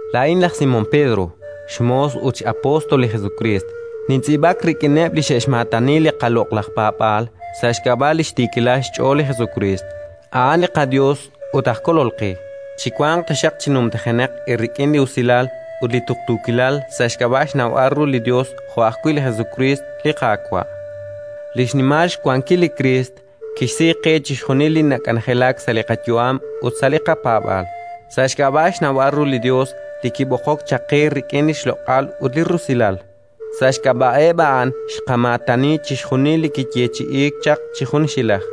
Laa'in laj Simón Pedro, xmoos ut x'apóstol li Jesukriist, nintz'iib'ak rik'ineb' li xe'xmaatani li qaloq'laj paab'aal sa' xk'ab'a' li xtiikilal xch'ool li Jesukriist, a'an li qaYos ut aj Kolol qe. Chiwanq taxaq chi numtajenaq eerik'in li usilal ut li tuqtuukilal sa' xk'ab'a' xnawb'al ru li li Yos jo' ajwi' li Jesukriist, li Qaawa'. Li xnimal xwankil li Kriist kixsi qe chixjunil li nak'anjelak sa' li qayu'am ut sa' li qapaab'aal, sa' xk'ab'a' xnawb'al ru li Yos li kib'oqok chaq qe rik'in li xloq'al ut li rusilal. Sa' xk'ab'a'eb' a'an xqamaatani chixjunil li kiyeechi'iik chaq chi junxilaj,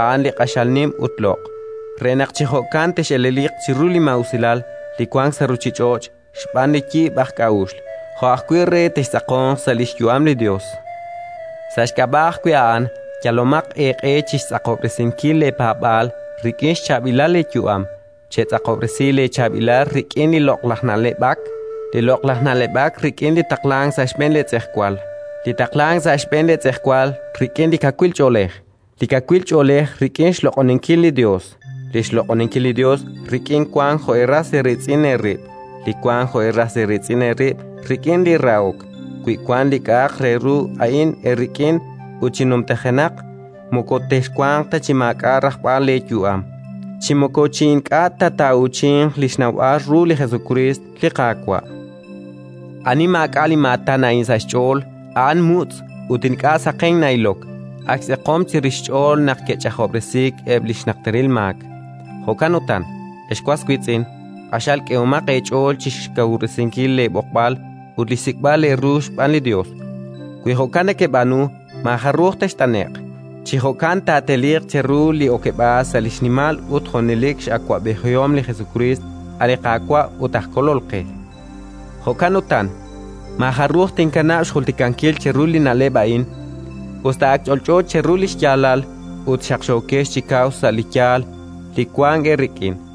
a'an li q'axal nim ut loq', re naq chi jo'kan tex'eleliq chiru li maa'usilal li wank sa' ruuchich'och' xb'aan li yib' aj k'a'uxl, jo' ajwi' re textz'aqonq sa' li xyu'am li Yos. Sa' xk'ab'a' ajwi' a'an, yalomaq eeq'e chi xtz'aqob'resinkil leepaab'aal rik'in xchaab'ilal leeyu'am; chetz'aqob'resi leechaab'ilal rik'in li loq'laj na'leb'ak, li loq'laj na'leb'ak rik'in li taqlank sa' xb'een leetz'ejwal, li taqlank sa' xb'een leetz'ejwal rik'in li kawil ch'oolej, li kawil ch'oolej rik'in xloq'oninkil li Yos, li xloq'oninkil li Yos rik'in wank jo' eeras eeriitz'in eerib', li wank jo' eeras eeriitz'in eerib' rik'in li rahok. Wi wank li k'a'aq re ru a'in eerik'in ut chi numtajenaq, moko texwanq ta chi maak'a' rajb'al leeyu'am, chi moko chi ink'a' ta taa'uuchinq li xnawb'al ru li Jesukriist, li Qaawa'. Ani maak'a' li maatan a'in sa' xch'ool, a'an mutz' ut ink'a' saqenk na'ilok, ak xtz'eqom chirix xch'ool naq ke'ch'ajob'resiik eb' li xnajteril maak. Jo'kan utan, ex was wiitz'in, q'axal k'ehomaq eech'ool chi xkawub'resinkil leeb'oqb'al ut li xsik'b'al eeru xb'aan li Yos. Wi jo'kan nekeb'aanu, maajaruj text'ane'q. Chi jo'kan taateliiq cheru li okeb'aal sa' li xnimal ut junelik x'awab'ejihom li Jesukriist, a' li Qaawa' ut aj Kolol qe. Jo'kan utan, maajaruj tinkanab' xjultikankil cheru li na'leb' a'in, us ta ak ch'olch'o cheru li xyaalal ut xaqxookex chi kaw sa' li yaal li wank eerik'in.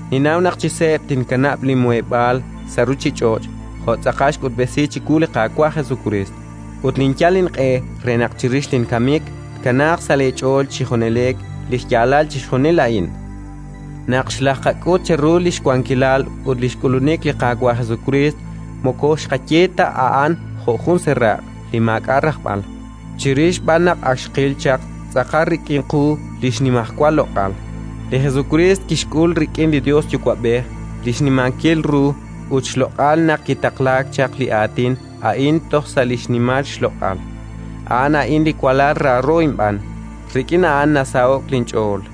Ninnaw naq chi seeb' tinq'ajq tinsutq'iiq, jo' tz'aqal xk'utb'esi chiwu li Qaawa' Jesukriist. Ut tinyal inq'e re naq chirix ajwi' linkamik tkanaaq sa' leech'ool chi junelik li xyaalal chixjunil a'in. Naq xlajqak'ut cheru li xwankilal ut li xk'ulunik li Qaawa' Jesukriist moko xqaye ta a'an jo' jun seeraq' li maak'a' rajb'al, chirix b'an naq ak xqil chaq tz'aqal rik'in qu li xnimajwal loq'al. Li Jesukriist kixk'ul rik'in li Yos Yuwa'b'ej li xnimankil ru ut xloq'al naq kitaqlaak chaq li aatin a'in toj sa' li xnimal xloq'al: “A'an a'in li walal raaro inb'aan; rik'in a'an nasaho'k linch'ool”.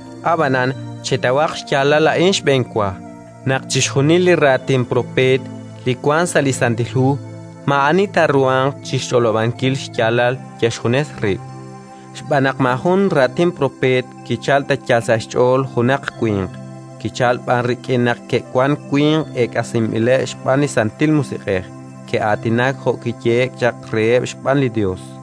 Ab'anan chetawaq xyaalal a'in xb'enwa: naq chixjunil li raatin propeet li wank sa' li Santil Hu maa'ani taaruhanq chi xch'olob'ankil xyaalal yal xjunes rib', xb'aan naq maajun raatin propeet kichalk ta yal sa' xch'ool junaq winq, kichalk b'an rik'in naq ke'wank winq eek'asinb'ileb' xb'aan li Santil Musiq'ej, ke'aatinak jo' kiyehe'k chaq reheb' xb'aan li Yos.